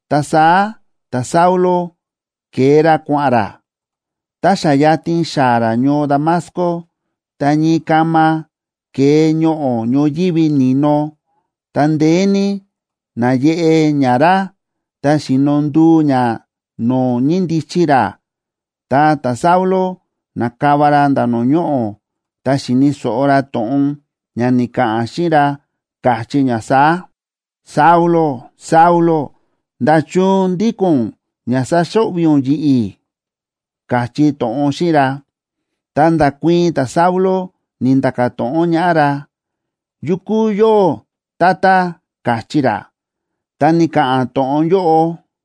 Ta saá ta̱Saulo ke̱e ra kua̱ꞌa̱n ra. Tá xa yatin xaa̱ ra ñoo Damasco, ta ñii kama ke̱e ñoꞌo̱ ñoyívi ni̱no, ta ndeé ní náyeꞌe ña ra, ta xi̱no nduu ña no̱o̱ ñíndichi ra. Ta ta̱Saulo na̱kava ra nda̱ no̱o̱ ñoꞌo̱, ta xi̱ni̱ so̱ꞌo ra to̱ꞌon ña ni̱ka̱ꞌa̱n xíꞌin ra, káchí ña saá: ―Saulo, Saulo, ¿nda̱chun ndíko̱n ún ña sáxo̱ꞌvi̱ ún yi̱ꞌi̱? ―káchí to̱ꞌon xíꞌin ra. Ta nda̱kuii̱n ta̱Saulo, ni̱nda̱ka̱ to̱ꞌon ñaꞌá ra: ―¿Yu kúu yóꞌó, Tata? ―káchí ra. Ta ni̱ka̱ꞌa̱n to̱ꞌon yóꞌo: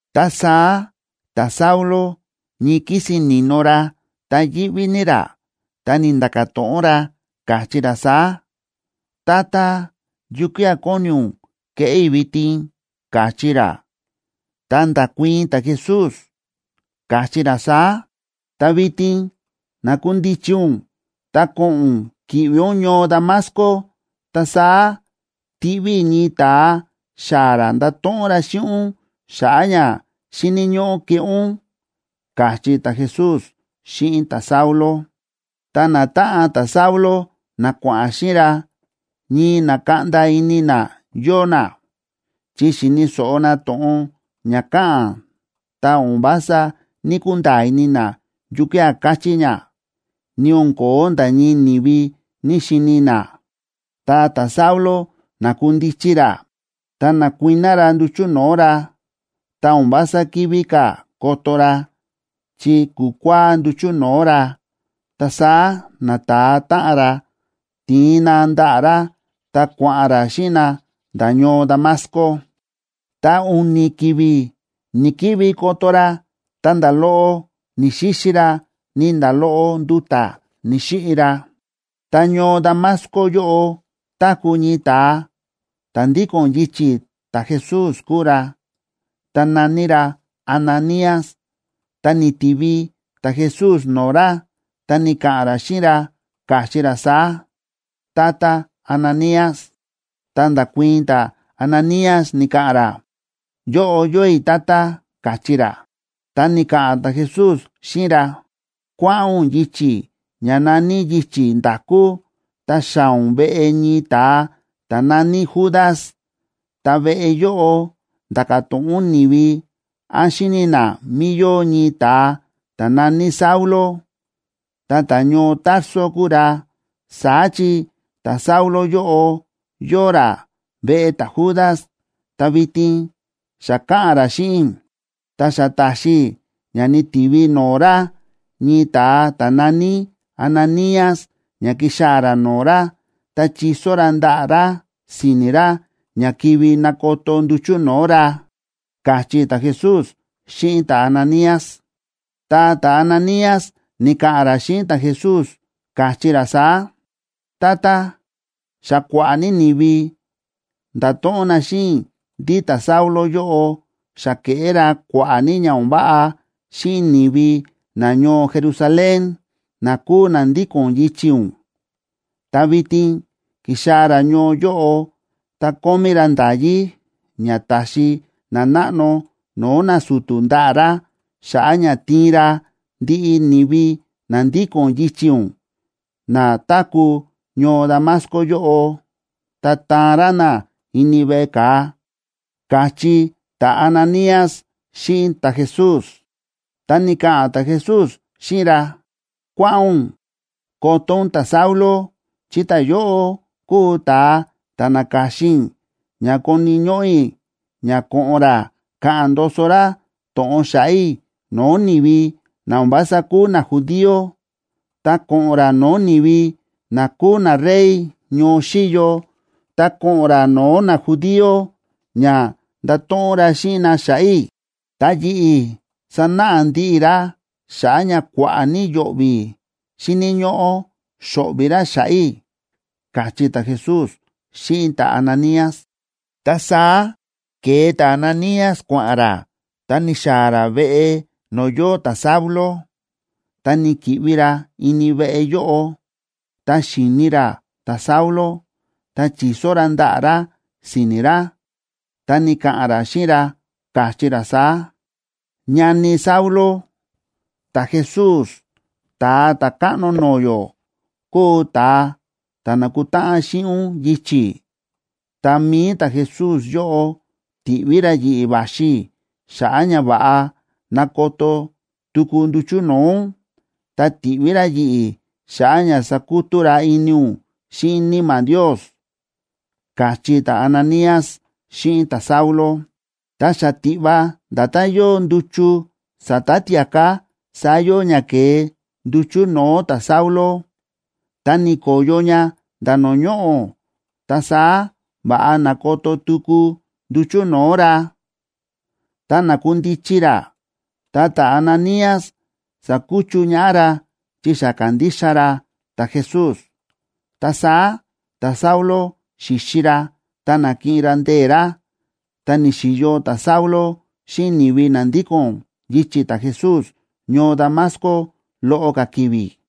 Ta saá ta̱Saulo ñii kísin ni̱no ra, ta yíꞌví ní ra, ta ni̱nda̱ka̱ to̱ꞌon ra, káchí ra saá: ―Tata, ¿yukía̱ kóni ún keꞌé i̱ vitin? ―káchí ra. Ta nda̱kuii̱n ta̱Jesús, káchí ra saá: ―Ta vitin nakundichi ún ta ko̱ꞌo̱n ún ki̱ꞌvi ún ñoo Damasco, ta saá tiꞌví i̱ ñii ta̱a xaa̱ ra ndato̱ꞌon ra xíꞌin ún xa̱ꞌa̱ ña xíni̱ ñóꞌó keꞌé ún ―káchí ta̱Jesús xíꞌin ta̱Saulo. Ta natáꞌan ta̱Saulo na kua̱ꞌa̱n xíꞌin ra, ñii na̱kaꞌnda ini na yóo na, chi xi̱ni̱ so̱ꞌo na to̱ꞌon ña káꞌa̱n ta o̱n vása ní‑kunda̱a̱ ini na yukía̱ káchí ña, ni o̱n ko̱ó nda̱ ñii ni̱vi ní‑xini na. Ta ta̱Saulo na̱kundichi ra ta na̱kuiná ra nduchu̱ no̱o̱ ra, ta o̱n vása kivi ka̱ koto ra, chi ku̱kua̱á nduchu̱ no̱o̱ ra. Ta saá nata̱a táꞌan ra ti̱in na ndaꞌa̱ ra ta kua̱ꞌa̱n ra xíꞌin na nda̱ ñoo Damasco. Ta u̱ni̱ ki̱vi̱ ni̱‑kivi koto ra ta nda̱ loꞌo ni̱‑xixi ra, ni nda̱ loꞌo nduta̱ ni̱‑xiꞌi ra. Ta ñoo Damasco yóꞌo táku̱ ñii ta̱a, ta̱ ndíko̱n yichi̱ ta̱Jesús kúu ra, ta na̱ní ra Ananías. Ta ni̱tivi ta̱Jesús no̱o̱ ra ta ni̱ka̱ꞌa̱n ra xíꞌin ra, káchí ra saá: ―¡Tata Ananías! Ta nda̱kuii̱n ta̱Ananías, ni̱ka̱ꞌa̱n ra: ―Yóꞌo yóo i̱, Tata ―káchí ra. Ta ni̱ka̱ꞌa̱n ta̱Jesús xíꞌin ra: ―Kua̱ꞌa̱n ún yichi̱ ña na̱ní Yichi̱ Nda̱kú ta xaa̱ ún veꞌe ñii ta̱a ta̱ na̱ní Judas, ta veꞌe yóꞌo nda̱ka̱ to̱ꞌon ún ni̱vi án xíni̱ na mí yóo ñii ta̱a ta̱ na̱ní Saulo, ta ta̱ñoo Tarso kúu ra. Saá chi ta̱Saulo yóꞌo yóo ra veꞌe ta̱Judas, ta vitin xa káꞌa̱n ra xíꞌin i̱. Ta xa ta̱xi i̱ ña ni̱tivi no̱o̱ ra ñii ta̱a ta̱ na̱ní Ananías ña ki̱xaa̱ ra no̱o̱ ra, ta chi̱so ra ndaꞌa̱ ra si̱ni̱ ra ña kivi nakoto nduchu̱ no̱o̱ ra ―káchí ta̱Jesús xíꞌin ta̱Ananías. Ta ta̱Ananías ni̱ka̱ꞌa̱n ra xíꞌin ta̱Jesús, káchí ra saá: ―Tata, xa kua̱ꞌa̱ ní ni̱vi nda̱to̱ꞌon na xíꞌin i̱ ndí ta̱Saulo yóꞌo xa ke̱ꞌé ra kua̱ꞌa̱ ní ña o̱n váꞌa xíꞌin ni̱vi nañoo Jerusalén, na kúu na ndíko̱n yichi̱ ún. Ta vitin ki̱xaa̱ ra ñoo yóꞌo, ta kómí ra nda̱yí ña ta̱xi nanáꞌno no̱o̱ nasu̱tu̱ ndaꞌa̱ ra xa̱ꞌa̱ ña tiin ra ndiꞌi ni̱vi na ndíko̱n yichi̱ ún na táku̱ ñoo Damasco yóꞌo, ta taan ra na ini veꞌe ka̱a ―káchí ta̱Ananías xíꞌin ta̱Jesús. Ta ni̱ka̱ꞌa̱n ta̱Jesús xíꞌin ra: ―Kua̱ꞌa̱n ún koto ún ta̱Saulo, chi ta̱yóꞌo kúu ta̱a ta̱ na̱ka̱xin i̱ ña koni̱ ñóꞌó i̱ ña ko̱ꞌo̱n ra ka̱ꞌa̱n ndoso ra to̱ꞌon xa̱ꞌa̱ i̱ no̱o̱ ni̱vi na o̱n vása kúu najudío, ta ko̱ꞌo̱n ra no̱o̱ ni̱vi na kúu narey ñoo xíyo, ta ko̱ꞌo̱n ra no̱o̱ najudíob ña ndato̱ꞌon ra xíꞌin na xa̱ꞌa̱ i̱. Ta yi̱ꞌi̱ sanáꞌa ndiꞌi i̱ ra xa̱ꞌa̱ ña kua̱ꞌa̱ ní yo̱ꞌvi̱ xíni̱ ñóꞌó xo̱ꞌvi̱ ra xa̱ꞌa̱ i̱ ―káchí ta̱Jesús xíꞌin ta̱Ananías. Ta saá ke̱e ta̱Ananías kua̱ꞌa̱n ra ta ni̱xaa̱ ra veꞌe no̱o̱ yóo ta̱Saulo, ta ni̱ki̱ꞌvi ra ini veꞌe yóꞌo. Tá xi̱ni ra ta̱Saulo, ta chi̱so ra ndaꞌa̱ ra si̱ni̱ ra, ta ni̱ka̱ꞌa̱n ra xíꞌin ra, káchí ra saá: ―Ñani i̱ Saulo, ta̱Jesús, Ta̱a Ta̱káꞌno no̱o̱ yó, kúu ta̱a ta̱ na̱kutáꞌan xíꞌin ún yichi̱, ta mi̱i ta̱Jesús yóꞌo ti̱ꞌví ra yi̱ꞌi̱ va̱xi i̱ xa̱ꞌa̱ ña va̱ꞌa nakoto tuku nduchu̱ no̱o̱ ún, ta ti̱ꞌví ra yi̱ꞌi̱ xa̱ꞌa̱ ña sakutú ra ini ún xíꞌin Níma̱ Ndios ―káchí ta̱Ananías xíꞌin ta̱Saulo. Ta xatiꞌva nda̱tán yóo nduchu sa̱ta̱ tia̱ká saá yóo ña ke̱e nduchu̱ no̱o̱ ta̱Saulo, ta ni̱ko̱yo ña nda̱ no̱o̱ ñoꞌo̱, ta saá va̱ꞌa na̱koto tuku nduchu̱ no̱o̱ ra. Ta na̱kundichi ra, ta ta̱Ananías sa̱kuchu ñaꞌá ra chi xa ka̱ndixa ra ta̱Jesús. Ta saá ta̱Saulo xi̱xi ra, ta na̱kiꞌin ra ndee̱ ra. Ta ni̱xi̱yo ta̱Saulo xíꞌin ni̱vi na ndíko̱n yichi̱ ta̱Jesús ñoo Damasco loꞌo ka̱ ki̱vi̱.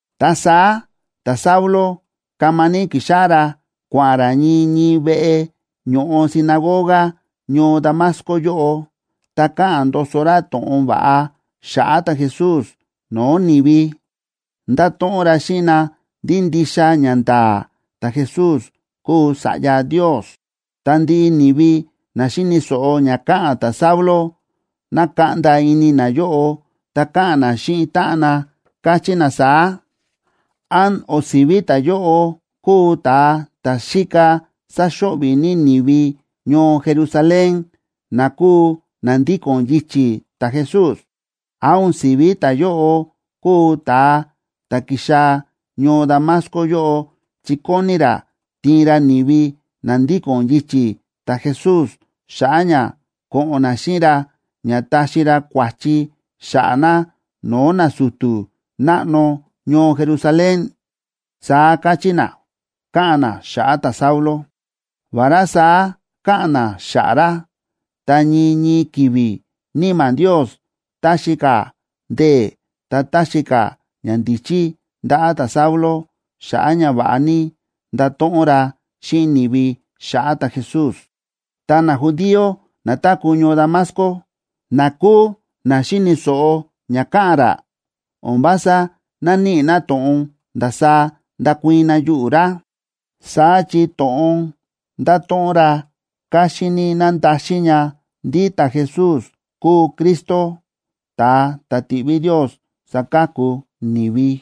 Ta saá ta̱Saulo kama ní ki̱xáꞌá ra kua̱ꞌa̱n ra ñii ñii veꞌe ño̱ꞌo sinagoga ñoo Damasco yóꞌo, ta káꞌa̱n ndoso ra to̱ꞌon va̱ꞌa xa̱ꞌa̱ ta̱Jesús no̱o̱ ni̱vi. Ndáto̱ꞌon ra xíꞌin na ndí ndixa ñanda̱a̱ ta̱Jesús kúu Sa̱ꞌya Ndios. Ta ndiꞌi ni̱vi na xi̱ni̱ so̱ꞌo ña káꞌa̱n ta̱Saulo, na̱kaꞌnda ini nayóꞌo, ta káꞌa̱n na xíꞌin táꞌan na, káchí na saá: ―¿Án o̱n si̱ví ta̱yóꞌo kúu ta̱a ta̱ xíka sáxo̱ꞌvi̱ ní ni̱vi ñoo Jerusalén na kúu na ndíko̱n yichi̱ ta̱Jesús? ¿Án o̱n si̱ví ta̱yóꞌo kúu ta̱a ta̱ ki̱xaa̱ ñoo Damasco yóꞌo chi kóni ra tiin ra ni̱vi na ndíko̱n yichi̱ ta̱Jesús xa̱ꞌa̱ ña ko̱ꞌo̱n na xíꞌin ra ña taxi ra kua̱chi xa̱ꞌa̱ na no̱o̱ nasu̱tu̱ náꞌno ñoo Jerusalén? ―saá káchí na, káꞌa̱n na xa̱ꞌa̱ ta̱Saulo. Vará saá káꞌa̱n na xa̱ꞌa̱ ra, ta ñii ñii ki̱vi̱ Níma̱ Ndios táxi ka̱ ndee̱, ta táxi ka̱ ñandíchí ndaꞌa̱ ta̱Saulo, xa̱ꞌa̱ ña va̱ꞌa ní ndato̱ꞌon ra xíꞌin ni̱vi xa̱ꞌa̱ ta̱Jesús. Ta najudío na táku̱ ñoo Damasco, na kúu na xi̱ni̱ so̱ꞌo ña káꞌa̱n ra, o̱n vása náníꞌi na to̱ꞌon ndasaá ndakuii̱n na yuꞌu̱ ra. Saá chi to̱ꞌon ndáto̱ꞌon ra káxín ní na̱ndaxin ña ndí ta̱Jesús kúu Cristo, ta̱a ta̱ ti̱ꞌví Ndios saka̱ku ni̱vi.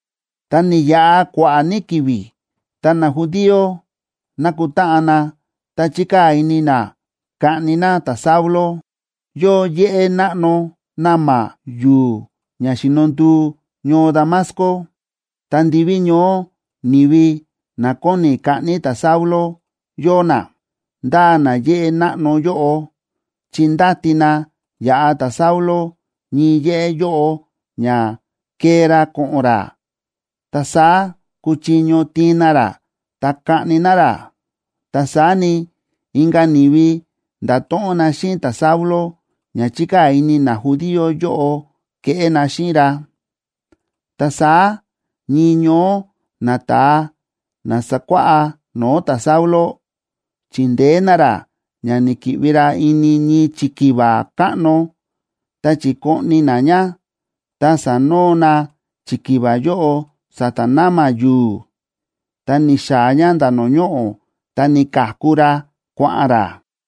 Ta ni̱yaꞌa kua̱ꞌa̱ ní ki̱vi̱, ta najudío na̱kutáꞌan na ta chi̱kaa̱ ini na kaꞌni na ta̱Saulo. Yóo yéꞌé náꞌno na̱ma̱ yu̱u̱ ña xíno nduu ñoo Damasco, ta ndiví ñoó ni̱vi na kóni kaꞌni ta̱Saulo yóo na, ndáa na yéꞌé náꞌno yóꞌo, chi ndáti na yaꞌa ta̱Saulo ñii yéꞌé yóꞌo ña kee ra ko̱ꞌo̱n ra, ta saá kuchiño tiin na ra ta kaꞌni na ra. Ta saá ni, inka̱ ni̱vi nda̱to̱ꞌon na xíꞌin ta̱Saulo ña chi̱kaa̱ ini najudío yóꞌo keꞌé na xíꞌin ra. Ta saá ñii ñoó nata̱a na sákuáꞌá no̱o̱ ta̱Saulo, chi̱ndeé na ra ña ni̱ki̱ꞌvi ra ini ñii chikiva káꞌno, ta chi̱koꞌni na ña, ta sa̱noo na chikiva yóꞌo sa̱ta̱ na̱ma̱ yu̱u̱, ta ni̱xaa̱ ña nda̱ no̱o̱ ñoꞌo̱, ta ni̱ka̱ku ra kua̱ꞌa̱n ra.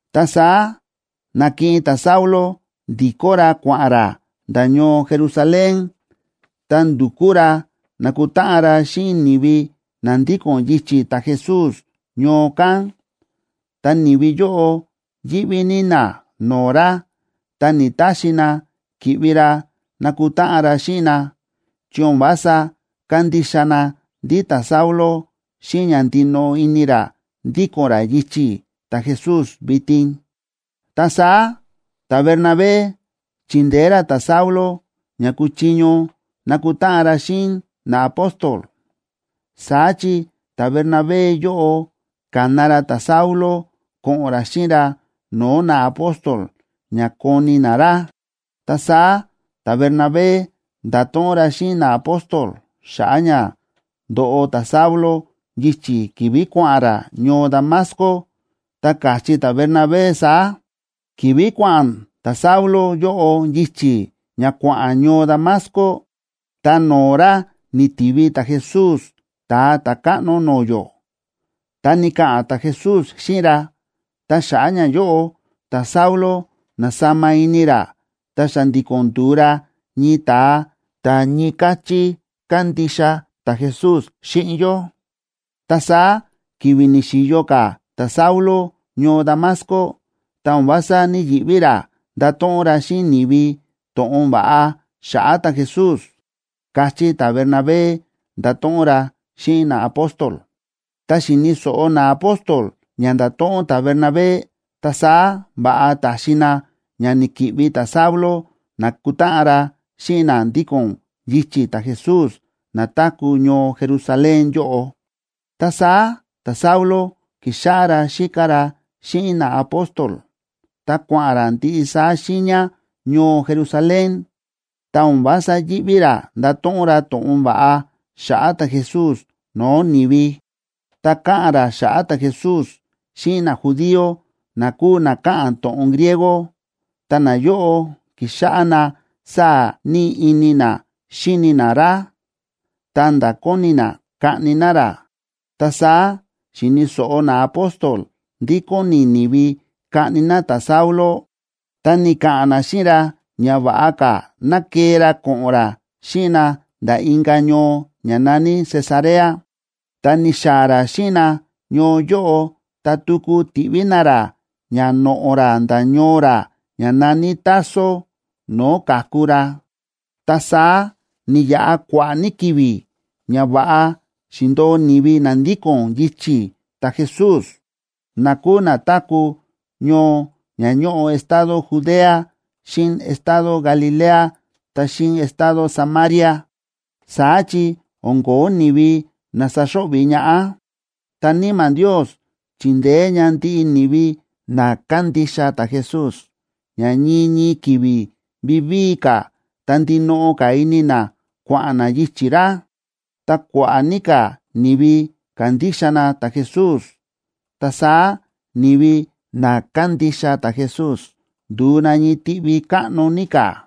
Ta saá na̱kiꞌin ta̱Saulo ndi̱kó ra kua̱ꞌa̱n ra nda̱ ñoo Jerusalén, ta ndu̱kú ra nakutáꞌan ra xíꞌin ni̱vi na ndíko̱n yichi̱ ta̱Jesús ñoo kán, ta ni̱vi yóꞌo yíꞌví ní na no̱o̱ ra. Ta ni̱‑taxi na ki̱ꞌvi ra nakutáꞌan ra xíꞌin na, chi o̱n vása kándixa na ndí ta̱Saulo xíꞌin ña ndinoꞌo ini ra ndíko̱n ra yichi̱ ta̱Jesús vitin. Ta saá ta̱Bernabé chi̱ndeé ra ta̱Saulo ña kuchiño nakutáꞌan ra xíꞌin naapóstol. Saá chi ta̱Bernabé yóꞌo ka̱na ra ta̱Saulo ko̱ꞌo̱n ra xíꞌin ra no̱o̱ naapóstol ña koni na ra. Ta saá ta̱Bernabé nda̱to̱ꞌon ra xíꞌin naapóstol xa̱ꞌa̱ ña ndo̱ꞌo ta̱Saulo yichi̱ ki̱vi̱ kua̱ꞌa̱n ra ñoo Damasco, ta káchí ta̱Bernabé saá: ―Ki̱vi̱ kua̱ꞌa̱n ta̱Saulo yóꞌo yichi̱ ña kua̱ꞌa̱n ñoo Damasco, ta no̱o̱ ra ni̱tivi ta̱Jesús Ta̱a Ta̱káꞌno no̱o̱ yó, ta ni̱ka̱ꞌa̱n ta̱Jesús xíꞌin ra. Ta xa̱ꞌa̱ ñayóꞌo, ta̱Saulo na̱sama ini ra ta xa̱ndi̱ko̱n ndu̱u ra ñii ta̱a ta̱ ñii káchí kándixa ta̱Jesús xíꞌin yó. Ta saá ki̱vi̱ ni̱xi̱yo ka̱ ta̱Saulo ñoo Damasco, ta o̱n vása ní‑yiꞌví ra ndáto̱ꞌon ra xíꞌin ni̱vi to̱ꞌon va̱ꞌa xa̱ꞌa̱ ta̱Jesús ―káchí ta̱Bernabé, nda̱to̱ꞌon ra xíꞌin naapóstol. Tá xi̱ni̱ so̱ꞌo naapóstol ña nda̱to̱ꞌon ta̱Bernabé, ta saá va̱ꞌa ta̱xi na ña ni̱ki̱ꞌvi ta̱Saulo nakutáꞌan ra xíꞌin na ndíko̱n yichi̱ ta̱Jesús na táku̱ ñoo Jerusalén yóꞌo. Ta saá ta̱Saulo ki̱xáꞌá ra xíka ra xíꞌin naapóstol, ta kua̱ꞌa̱n ra ndiꞌi saá xiiña ñoo Jerusalén, ta o̱n vása yíꞌví ra ndáto̱ꞌon ra to̱ꞌon va̱ꞌa xa̱ꞌa̱ ta̱Jesús no̱o̱ ni̱vi. Ta káꞌa̱n ra xa̱ꞌa̱ ta̱Jesús xíꞌin najudío na kúu na káꞌa̱n to̱ꞌon griego, ta nayóꞌo ki̱xáꞌá na sáa̱ ní ini na xíni na ra, ta̱nda̱ kóni na kaꞌni na ra. Ta saá xi̱ni̱ so̱ꞌo naapóstol ndí kóni ni̱vi kaꞌni na ta̱Saulo, ta ni̱ka̱ꞌa̱n na xíꞌin ra ña va̱ꞌa ka̱ ná kee ra ko̱ꞌo̱n ra xíꞌin na nda̱ inka̱ ñoo ña na̱ní Cesarea. Tá ni̱xaa̱ ra xíꞌin na ñoo yóꞌo ta tuku ti̱ꞌví na ra ña noꞌo̱ ra nda̱ ñoo ra ña na̱ní Tarso, no̱o̱ ka̱ku ra. Ta saá, ni̱yaꞌa kua̱ꞌa̱ ní ki̱vi̱ ña va̱ꞌa xi̱ndo̱o ni̱vi na ndíko̱n yichi̱ ta̱Jesús, na kúu na táku̱ ñoo ña ñóꞌo estado Judea xíꞌin estado Galilea ta xíꞌin estado Samaria. Saá chi o̱n ko̱ó ni̱vi na saxo̱ꞌvi̱ ñaꞌá, ta Níma̱ Ndios chi̱ndeé ña ndiꞌi ni̱vi na kándixa ta̱Jesús ña ñii ñii ki̱vi̱ vivíi ka̱ ta ndinoꞌo ka̱ ini na kua̱ꞌa̱n na yichi̱ ra. Ta kua̱ꞌa̱ ní ka̱ ni̱vi ka̱ndixa na ta̱Jesús. Ta saá ni̱vi na kándixa ta̱Jesús ndu̱u na ñii tiꞌvi káꞌno ní ka̱.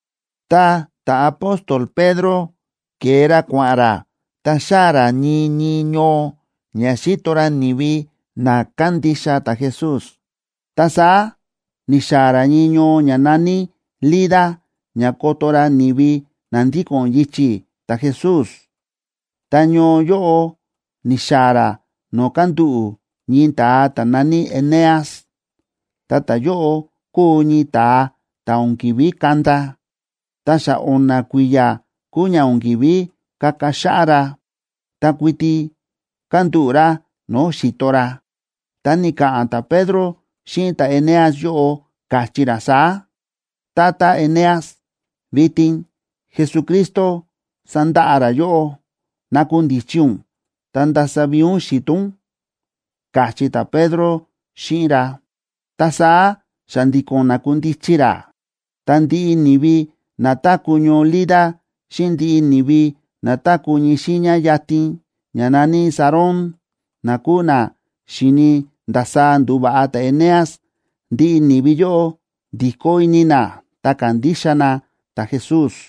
Ta ta̱apóstol Pedro ke̱e ra kua̱ꞌa̱n ra ta xáa̱ ra ñii ñii ñoo ña xíto ra ni̱vi na kándixa ta̱Jesús. Ta saá ni̱xaa̱ ra ñii ñoo ña na̱ní Lida ña koto ra ni̱vi na ndíko̱n yichi̱ ta̱Jesús. Ta ñoo yóꞌo ni̱xaa̱ ra no̱o̱ kándúꞌu̱ ñii ta̱a ta̱ na̱ní Eneas, ta ta̱yóꞌo kúu ñii ta̱a ta̱ o̱n ki̱ví kanda, ta xa o̱na̱ kui̱ya̱ kúu ña o̱n ki̱ví kaka xáꞌá ra, ta kuiti kándúꞌu̱ ra no̱o̱ xi̱to ra. Ta ni̱ka̱ꞌa̱n ta̱Pedro xíꞌin ta̱Eneas yóꞌo, káchí ra saá: ―Tata Eneas, vitin Jesucristo sándaꞌa ra yóꞌó. Nakundichi ún, ta ndasa vi̱i̱ ún xi̱to ún ―káchí ta̱Pedro xíꞌin ra. Ta saá xa̱ndi̱ko̱n na̱kundichi ra. Ta ndiꞌi ni̱vi na táku̱ ñoo Lida xíꞌin ndiꞌi ni̱vi na táku̱ ñii xiiña yatin, ña na̱ní Sarón, na kúu na xi̱ni ndasaá ndu̱va̱ꞌa ta̱Eneas, ndiꞌi ni̱vi yóꞌo ndi̱kó ini na ta ka̱ndixa na ta̱Jesús.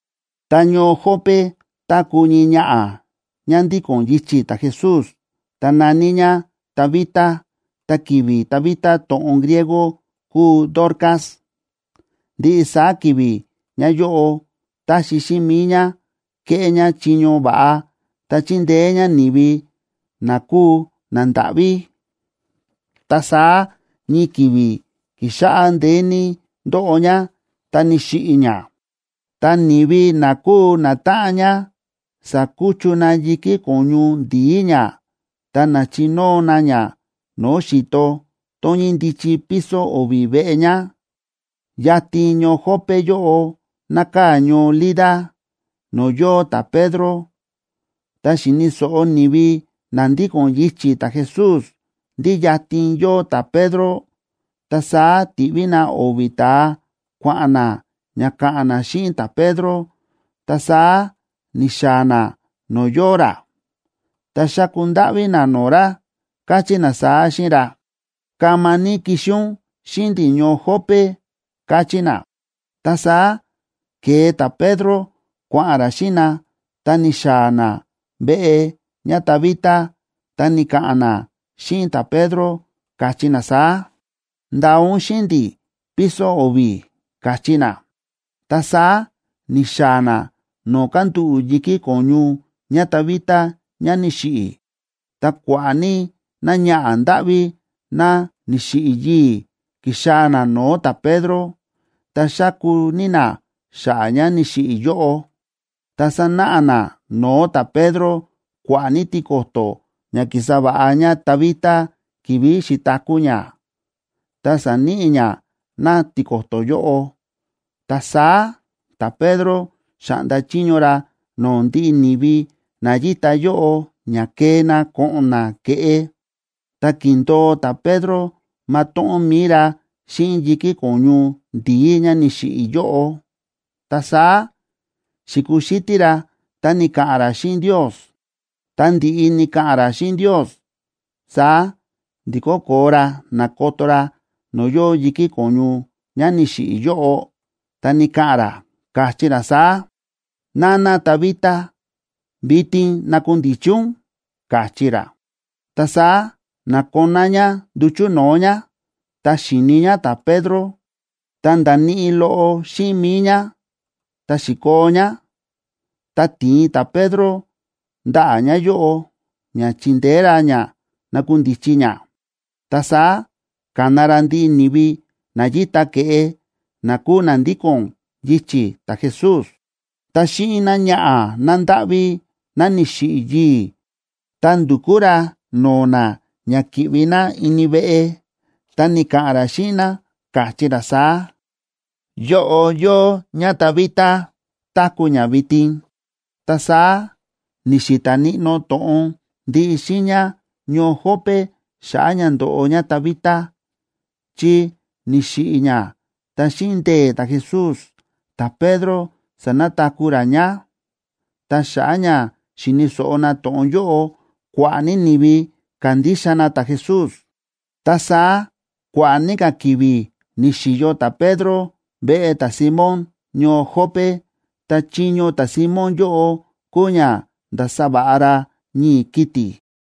Ta ñoo Jope táku̱ ñii ñaꞌa̱ ñá ndíko̱n yichi̱ ta̱Jesús, ta na̱ní ñá Tabita (ta ki̱vi̱ Tabita to̱ꞌon griego kúu Dorcas). Ndiꞌi saá ki̱vi̱ ñáyóꞌo táxi xíꞌin mi̱i ñá kéꞌé ñá chiño va̱ꞌa, ta chíndeé ñá ni̱vi na kúu nandáꞌví. Ta saá ñii ki̱vi̱ ki̱xáꞌá ndeé ní ndóꞌo ñá ta ni̱xiꞌi̱ ñá. Ta ni̱vi na kúu natáꞌan ñá sa̱kuchu na yi̱kí ko̱ñu ndi̱í ñá ta na̱chinóo na ña no̱o̱ xi̱to tón ñíndichi piso o̱vi̱ veꞌe ñá. Yatin ñoo Jope yóꞌo nákaa̱ ñoo Lida, no̱o̱ yóo ta̱Pedro. Tá xi̱ni̱ so̱ꞌo ni̱vi na ndíko̱n yichi̱ ta̱Jesús ndí yatin yóo ta̱Pedro, ta saá ti̱ꞌví na o̱vi̱ ta̱a kua̱ꞌa̱n na ña ka̱ꞌa̱n na xíꞌin ta̱Pedro. Ta saá ni̱xaa̱ na no̱o̱ yóo ra, ta xa̱ku ndáꞌví na no̱o̱ ra, káchí na saá xíꞌin ra: ―Kama ní kixi ún xíꞌin ndi̱ ñoo Jope ―káchí na. Ta saá ke̱e ta̱Pedro kua̱ꞌa̱n ra xíꞌin na, ta ni̱xaa̱ na veꞌe ñáTabita, ta ni̱ka̱ꞌa̱n na xíꞌin ta̱Pedro, káchí na saá: ―Ndaa ún xíꞌin ndi̱ piso o̱vi̱ ―káchí na. Ta saá ni̱xaa̱ na no̱o̱ kándúꞌu̱ yi̱kí ko̱ñu ñáTabita ñá ni̱xiꞌi̱. Ta kua̱ꞌa̱ ní náñaꞌa̱ ndáꞌví ná ni̱xiꞌi̱ yii̱ ki̱xaa̱ ná no̱o̱ ta̱Pedro, ta xáku ní ná xa̱ꞌa̱ ñá ni̱xiꞌi̱ yóꞌo, ta sa̱náꞌa ná no̱o̱ ta̱Pedro kua̱ꞌa̱ ní tiko̱to̱ ña ki̱sa va̱ꞌa ñáTabita ki̱vi̱ xi̱taku̱ ñá, ta sa̱níꞌi ñá ná tiko̱to̱ yóꞌo. Ta saá ta̱Pedro xa̱ꞌnda chiño ra no̱o̱ ndiꞌi ni̱vi na yíta yóꞌo ña kee na ko̱ꞌo̱n na ke̱ꞌe. Ta ki̱ndo̱o ta̱Pedro matóꞌón mi̱i ra xíꞌin yi̱kí ko̱ñu ndi̱í ñá ni̱xiꞌi̱ yóꞌo. Ta saá xi̱kuxítí ra ta ni̱ka̱ꞌa̱n ra xíꞌin Ndios. Ta ndi̱ꞌi ni̱ka̱ꞌa̱n ra xíꞌin Ndios, saá ndi̱kó koo ra na̱koto ra no̱o̱ yóo yi̱kí ko̱ñu ñá ni̱xiꞌi̱ yóꞌo, ta ni̱ka̱ꞌa̱n ra, káchí ra saá: ―Nana Tabita, vitin nakundichi ún ―káchí ra. Ta saá na̱koná ñá nduchu̱ no̱o̱ ñá, ta xi̱ni ñá ta̱Pedro, ta nda̱níꞌi loꞌo xíꞌin mi̱i ñá, ta xi̱koo ñá. Ta ti̱in ta̱Pedro ndaꞌa̱ ñáyóꞌo ña chi̱ndeé ra ñá na̱kundichi ñá. Ta saá ka̱na ra ndiꞌi ni̱vi na yíta ke̱ꞌe, na kúu na ndíko̱n yichi̱ ta̱Jesús, ta xíꞌin náñaꞌa̱ nándáꞌví ná ni̱xiꞌi̱ yii̱, ta ndu̱kú ra no̱o̱ na ña ki̱ꞌvi na ini veꞌe, ta ni̱ka̱ꞌa̱n ra xíꞌin na, káchí ra saá: ―Yóꞌo yóo ñáTabita, táku̱ ñá vitin. Ta saá ni̱xi̱ta̱ níꞌnó to̱ꞌon ndiꞌi xiiña ñoo Jope xa̱ꞌa̱ ña ndo̱ꞌo ñáTabita, chi ni̱xiꞌi̱ ñá ta xíꞌin ndee̱ ta̱Jesús, ta̱Pedro sa̱nataku̱ ra ñá. Ta xa̱ꞌa̱ ña xi̱ni̱ so̱ꞌo na to̱ꞌon yóꞌo, kua̱ꞌa̱ ní ni̱vi ka̱ndixa na ta̱Jesús. Ta saá kua̱ꞌa̱ ní ka̱ ki̱vi̱ ni̱xi̱yo ta̱Pedro veꞌe ta̱Simón ñoo Jope. Ta chiño ta̱Simón yóꞌo kúu ña ndása va̱ꞌa ra ñii̱ kiti̱.